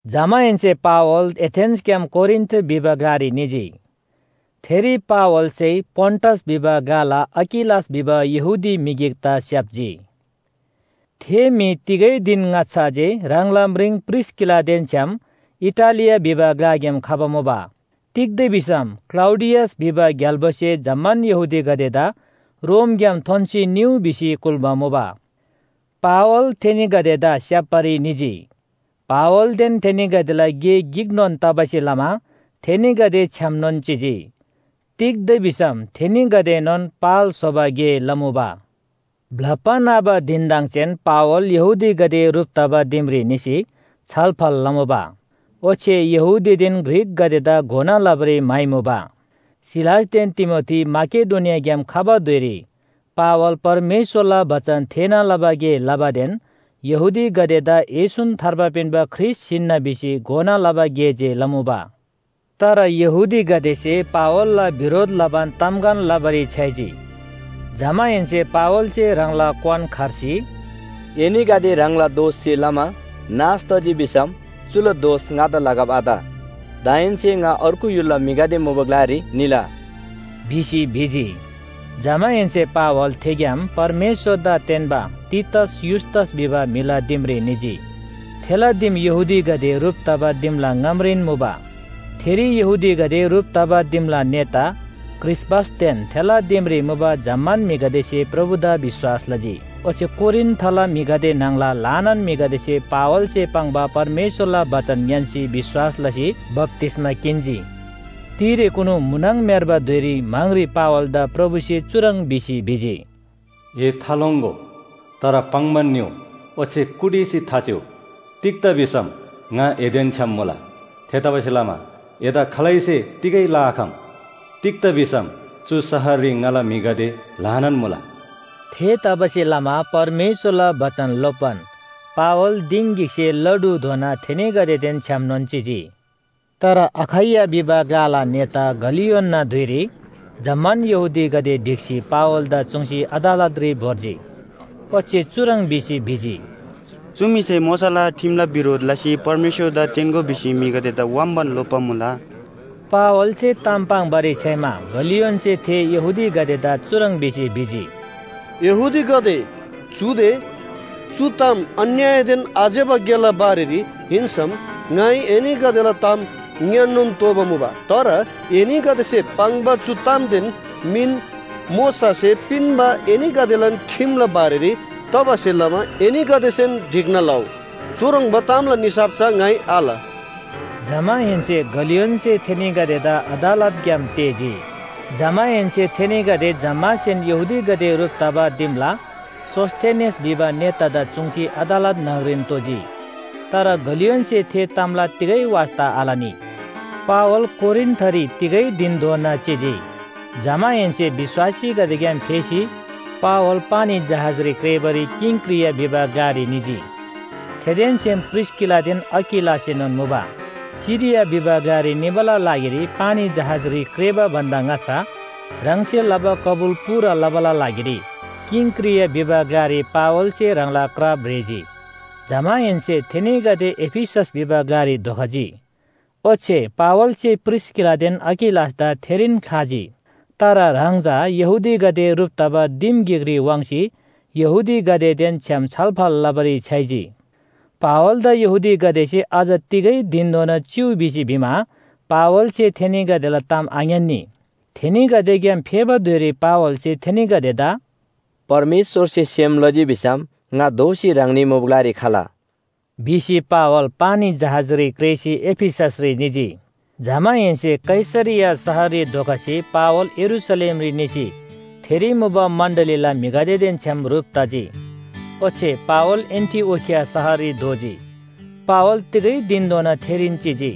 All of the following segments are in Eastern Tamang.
जमाहेन्‍से पावल एथेन्‍सग्‍याम कोरिन्‍थ भिबा ग्‍लारी निजी। थेरी पावलसे पोन्‍टस भिबा ग्‍लाला अकिलास भिबा यहूदी म्‍हि गिकदा स्‍याप्‍जी। थे म्‍हि तिगै धिन ङाच्‍छा जे ह्राङला म्रिङ प्रिस्‍किलादेन छ्‌याम इटालिया भिबा ग्‍लाग्‍याम खबा मुबा। तिग्‍दा भिसम क्‍लौडियस भिबा ग्‍याल्‍बोसे जम्‍मान यहूदीगदेदा रोमग्‍याम थोन्‍सी निउ भिसी कुल्‍बा मुबा। पावल थेनीगदेदा स्‍याप्‍बारी निजी। पावलदेन थेनीगदेला गे गिकनोन तबासे लमा थेनीगदे छ्‌यामनोन चिजी। तिग्‍दा भिसम थेनीगदेएनोन पाल स्‍होबा गे लमुबा। ब्‍लप्‍बा न्‍हबा धिनदङसेन पावल यहूदीगदे ह्रुप तबा दिमरी निसी छलफल लमुबा, ओच्‍छे यहूदीदेन ग्रीकगदेदा घोना लबारी म्‍हाइमुबा। सिलासदेन तिमोथी माकेडोनियाग्‍याम खबा धुइरी पावल परमेश्‍वरला बचन थेःना लबा गे लबादेन यहूदीगदेदा येशून थार्बा पिन्‍बा ख्रीष्‍ट हिन्‍ना भिसी घोना लबा गे जे लमुबा। तर यहूदीगदेसे पावलला बिरोध लबान तामगन लबारी छ्‌याइजी, जमाहेन्‍से पावलसे ह्राङला क्‍वान खर्सी, “एनीगदे ह्राङलान दोषसे लमा नाश तजी भिसम चुला दोष ङादा लगब आत। दाहेन्‍से, ङा अर्गु य्‍हुलला म्‍हिगदे मुबा ग्‍लारी निला” भिसी भिजी। जमाहेन्‍से पावल थेग्‍याम परमेश्‍वरदा तेन्‍बा तीतस युस्‍तस भिबा म्‍हिला दिमरी निजी। थेला दिम यहूदीगदे ह्रुप तबा दिमला ङामरीन मुबा। थेरी यहूदीगदे ह्रुप तबा दिमला नेता क्रिस्‍पसदेन थेला दिमरी मुबा जम्‍मान म्‍हिगदेसे प्रभुदा विश्‍वास लजी, ओच्‍छे कोरिन्‍थला म्‍हिगदे न्‍हङला ल्‍हानान म्‍हिगदेसे पावलसे पाङ्बा परमेश्‍वरला बचन ङ्‌यान्‍सी विश्‍वास लसी बप्‍तिस्‍मा किन्‍जी। तिरेकुनु म्‍हुनङ म्‍हेर्बा धुइरी म्‍हाङरी पावलदा प्रभुसे चुह्रङ् भिसी भिजी, “ए थालोङ्‍गो, तर पाङ्‌बान निउ, ओच्‍छे कुटिसी थाचिउ। तिग्‍दा भिसम ङा एदेन छ्‌याम मुला। थेतबासेलमा एदा खालैसे तिगै लआखम, तिग्‍दा भिसम चु शहररी ङाला म्‍हिगदे ल्‍हानान मुला।” थेतबासेलमा परमेश्‍वरला बचन लोप्‍बान पावल दिङ गिकसे ला ढुधोना थेनीगदेदेन छ्‌यामनोन चिजी। तर अखैया भिबा ग्‍लाला नेता गलियोनना धुइरी जम्‍मान यहूदीगदे ढिक्‍सी पावलदा चुङ्सी अदालतरी भोर्जी, ओच्‍छे चुह्रङ् भिसी भिजी, “चु म्‍हिसे मोशाला ठिमला बिरोध लसी परमेश्‍वरदा तेन्‍गो भिसी म्‍हिगदेदा व्‍हाम्‍बान लोप्‍बा मुला।” पावलसे ताम पाङ्‌बारी छ्‌याइमा गलियोनसे थे यहूदीगदेदा चुह्रङ् भिसी भिजी, “यहूदीगदे, चुदे चु ताम अन्‍यायदेन आज्‍यबा गेला बारेरी हिन्‍सम ङाइ एनीगदेला ताम ङ्‌यान्‍नोन तोःबा मुबा। तर एनीगदेसे पाङ्बा चु तामदेन मिन मोशासे पिन्‍बा एनीगदेलान ठिमला बारेरी तबासे लमा एनीगदेसेन ढिक्‍ना लउ। चुह्रङ्बा तामला निसाफ चा ङाइ आल।” जमाहेन्‍से गलियोनसे थेनीगदेदा अदालतग्‍याम तेःजी। जमाहेन्‍से थेनीगदे जम्‍मासेन यहूदीगदे ह्रुप तबा दिमला सोस्‍थेनेस भिबा नेतादा चुङ्सी अदालत न्‍हङरीन तोजी। तर गलियोनसे थे तामला तिगै वास्‍ता आलनी। पावल कोरिन्‍थरी तिगै धिनधोना चिजी। जमाहेन्‍से विश्‍वासीगदेग्‍याम फेसी पावल पानी जहाजरी क्रेःबारी किंक्रिया भिबा ग्‍लारी निजी। थेदेन छ्‌याम प्रिस्‍किलादेन अकिलासएनोन मुबा। सिरिया भिबा ग्‍लारी निबाला लागिरी पानी जहाजरी क्रेःबा भन्‍दा ङाच्‍छा ह्राङसे लबा कबुल पूरा लबाला लागिरी किंक्रिया भिबा ग्‍लारी पावलसे ह्राङला क्रा भ्रेजी। जमाहेन्‍से थेनीगदे एफिसस भिबा ग्‍लारी धोखजी, ओच्‍छे पावलसे प्रिस्‍किलादेन अकिलासदा थेरीन ख्‍लाजी। तर ह्राङ चा यहूदीगदे ह्रुप तबा दिम गिकरी वाङ्सी यहूदीगदेदेन छ्‌याम छलफल लबारी छ्‌याइजी। पावलदा यहूदीगदेसे अझ तिगै धिनधोना चिउ भिसी भिमा पावलसे थेनीगदेला ताम आङ्‌यान्‍नी। थेनीगदेग्‍याम फेबा धुइरी पावलसे थेनीगदेदा “परमेश्‍वरसे सेम लजी भिसम ङा दोःसी ह्राङनी मुबा ग्‍लारी खला” भिसी पावल पानी जहाजरी क्रेःसी एफिससरी निजी। जमाहेन्‍से कैसरिया शहररी धोखसी पावल यरूशलेमरी निसी थेरी मुबा मण्‍डलीला म्‍हिगदेदेन छ्‌याम ह्रुप तजी। ओच्‍छे पावल एन्‍टिओखिया शहररी धोजी। पावल तिगै धिनधोना थेरीन चिजी।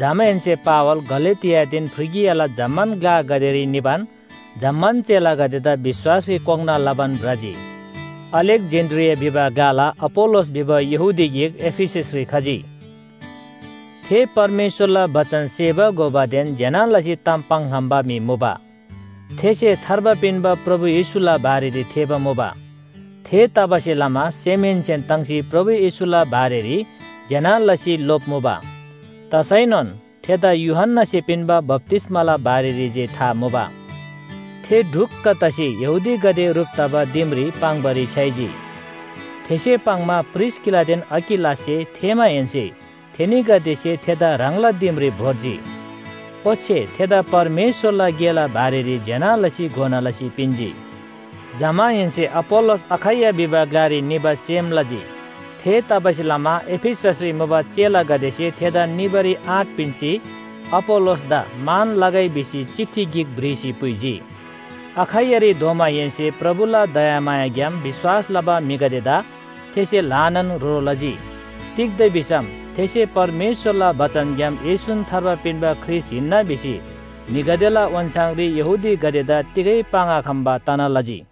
जमाहेन्‍से पावल गलातियादेन फ्रिगियाला जम्‍मान ग्‍लागदेरी निबान जम्‍मान चेलागदेदा विश्‍वासरी कोङ्‌ना लबान भ्रजी। अलेक्‍जेन्‍ड्रिया भिबा ग्‍लाला अपोल्‍लोस भिबा यहूदी गिक एफिससरी खजी। थे परमेश्‍वरला बचन सेबा घोबादेन ज्‍यना लसी ताम पाङ्‌खम्‍बा म्‍हि मुबा। थेसे थार्बा पिन्‍बा प्रभु येशूला बारेरी थेःबा मुबा, थेतबासेलमा सेमहेन्‍सेन ताङ्सी प्रभु येशूला बारेरी ज्‍यना लसी लोप्‍मुबा। तसैनोन थेदा यूहन्‍नासे पिन्‍बा बप्‍तिस्‍माला बारेरी जे था मुबा। थे ढुक्‍क तसी यहूदीगदे ह्रुप तबा दिमरी पाङ्‌बारी छ्‌याइजी। थेसे पाङ्‌मा प्रिस्‍किलादेन अकिलाससे थेःमाहेन्‍से थेनीगदेसे थेदा ह्राङला दिमरी भोर्जी। ओच्‍छे थेदा परमेश्‍वरला गेला बारेरी ज्‍यना लसी घोना लसी पिन्‍जी। जमाहेन्‍से अपोल्‍लोस अखैया भिबा ग्‍लारी निबा सेम लजी। थेतबासेलमा एफिससरी मुबा चेलागदेसे थेदा निबारी आँट पिन्‍सी, अपोल्‍लोसदा मान लगै भिसी चिठी गिक भ्रिसी पुइजी। अखैयारी धोमाहेन्‍से प्रभुला दयामायाग्‍याम विश्‍वास लबा म्‍हिगदेदा थेसे ल्‍हानान ह्रो लजी। तिग्‍दा भिसम थेसे परमेश्‍वरला बचनग्‍याम येशून थार्बा पिन्‍बा ख्रीष्‍ट हिन्‍ना भिसी म्‍हिगदेला ओन्‍छाङरी यहूदीगदेदा तिगै पाङ्‌आखम्‍बा तना लजी।